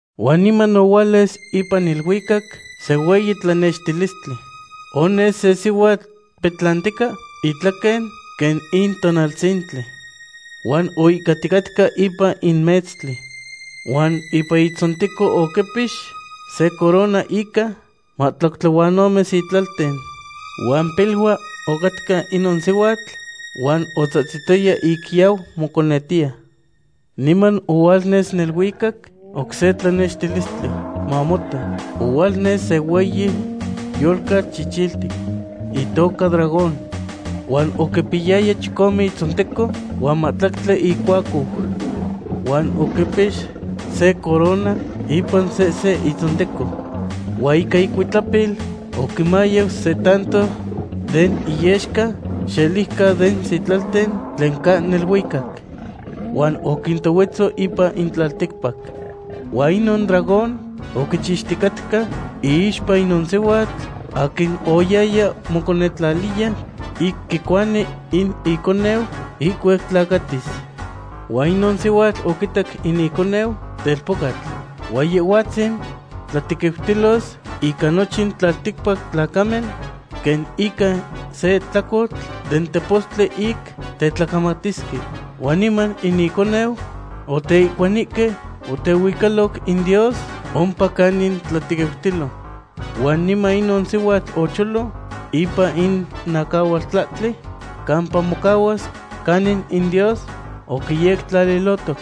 Huan niman ohualnes ipan neluicac se hueyi tlanextilistli. Ones se sihuatl petlantica itlaquen quen in tonaltzintli. Huan oihcaticatca ipan in metztli. Huan ipan itzonteco oquipix se corona ica mahtlactli huan ome sitlalten. Huan pilua ocatca inon sihuatl, huan otzahtzitoya ic yau moconetiya. Niman ohualnes neluicac oc se tlanextilistli. Mamota, ohualnes se hueyi yolcatl chichiltic, itoca dragón. Huan oquipiyaya chicome itzonteco huan mahtlactli icuacou. Huan oquipix se corona ipan sehse itzonteco. Huan ica icuitlapil oquinmayau se tanto den iyexca xeliuca den sitlalten tlen ca neluicac. Huan oquintohuetzo ipan in tlalticpac. Huan inon dragón oquichixticatca iixpa inon sihuatl aquin oyaya moconetlaliya ic quicuani in iconeu ihcuac tlacatis. Huan inon sihuatl oquitac in iconeu telpocatl. Huan Yehhuatzin tlatequiutilos ica nochin tlalticpac tlacamen quen ica se tlacotl den tepostli ic tetlacamatisque. Huan niman in iconeu oteihcuanihque huan otehuicaloc in Dios ompa canin tlatequiutilo. Huan niman inon sihuatl ocholo ipan in acahualtlahtli campa mocahuas canin in Dios oquiyectlalilohtoc.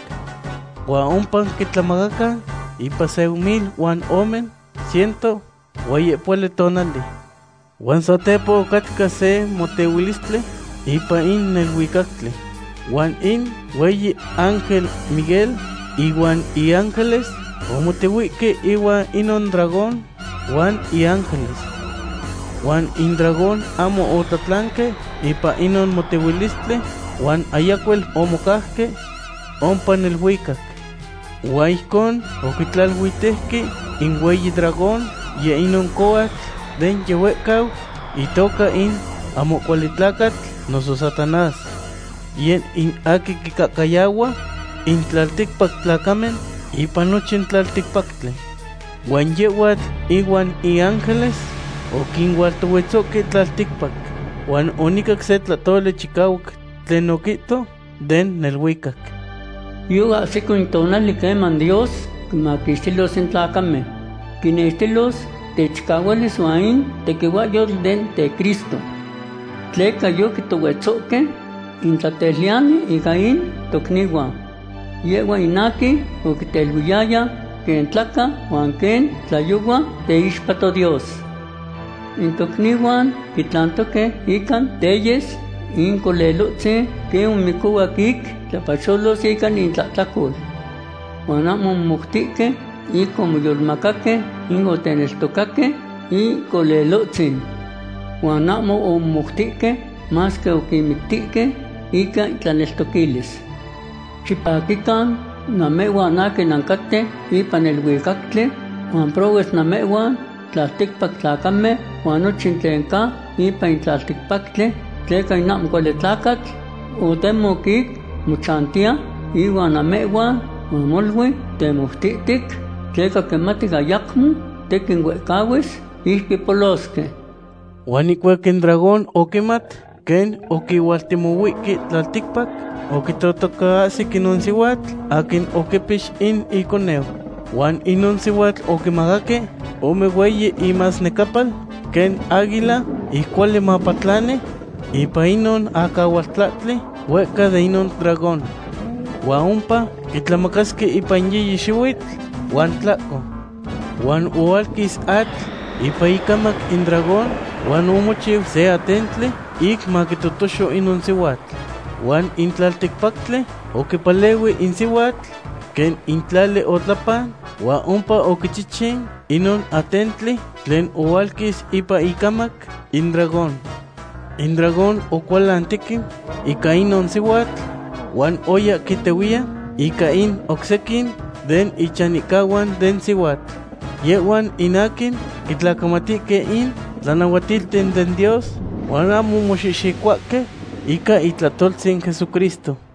Huan ompa quitlamacacan ipan se mil huan ome ciento huan yehpohuali tonali. Huan satepa ocatca se motehuilistli ipan in neluicactli. Huan in hueyi ángel Miguel ihuan iángeles omotehuihque ihuan inon dragón huan iángeles. Huan in dragón ahmo otlatlanque ipan inon motehuilistli, huan ayacuel omocauque ompa neluicac. Huan ijcon oquitlaluitejque in hueyi dragón, yeh inon cohuatl de yihuehcau, itoca in ahmo cuali tlacatl noso Satanás. Yeh in aquin quincahcayahua in tlalticpac tlacamen ipan nochin tlalticpactli. Huan yehhuatl ihuan iángeles oquinualtohuetzohque tlalticpac. Huan onicac se tlahtoli chicahuac tlen oquihto den neluicac: ―Yoahsico in tonali queman Dios quinmaquixtilos in tlacamen. Quinextilos techicahualis huan in tequihuahyotl den teCristo. Tleca yoquitohuetzohque in tlateluiyani ica in tocnihuan. Yehhua in aquin oquinteluiyaya quen tlahca huan quen tlayohua teixpa toDios. In tocnihuan quitlantoque ica teyes in Colelotzin quen omicohuac ic quixtlapacholos ica intlahtlacol. Huan ahmo omomoutihque ic omoyolmacaque ic oteneltocaque in Colelotzin. Huan ahmo omomoutihque, masque oquinmictihque ica intlaneltoquilis. ¡Xipaquican, namehhuan aquin nancaten ipan neluicactli! ¡Huan prohues namehhuan tlalticpac tlacamen huan nochin tlen ca ipan in tlalticpactli! Tleca in ahmo cuali tlacatl otemoc ic mochantiya ihuan namehhuan huan molui temoutihtic, tleca quimati ayacmo tequin huehcahuis ic quipolosque. Huan ihcuac in dragón oquimat quen oquihualtemohuihque tlalticpac, oquitotocaahsic inon sihuatl aquin oquipix in iconeu. Huan inon sihuatl oquimacaque ome hueyi imasnecapal quen águila, ic cuali mapatlani ipan inon acahualtlahtli huehca de inon dragón. Huan ompa quitlamacasque ipan yiyi xihuitl huan tlahco. Huan ohualquis atl ipan icamac in dragón huan omochiu se atentli ic maquitotoxo inon sihuatl. Huan in tlalticpactli oquipalehui in sihuatli, quen in tlali otlapan huan ompa oquichichin inon atentli tlen ohualquis ipan icamac in dragón. In dragón ocualan tequin ica inon sihuatl, huan oya quintehuiya ica in oc sequin den ichanihcahuan den sihuatl. Yehhuan in aquin quitlacamatihque in tlanahuatilten den Dios huan ahmo moxihxicohuahque ica itlahtoltzin Jesucristo.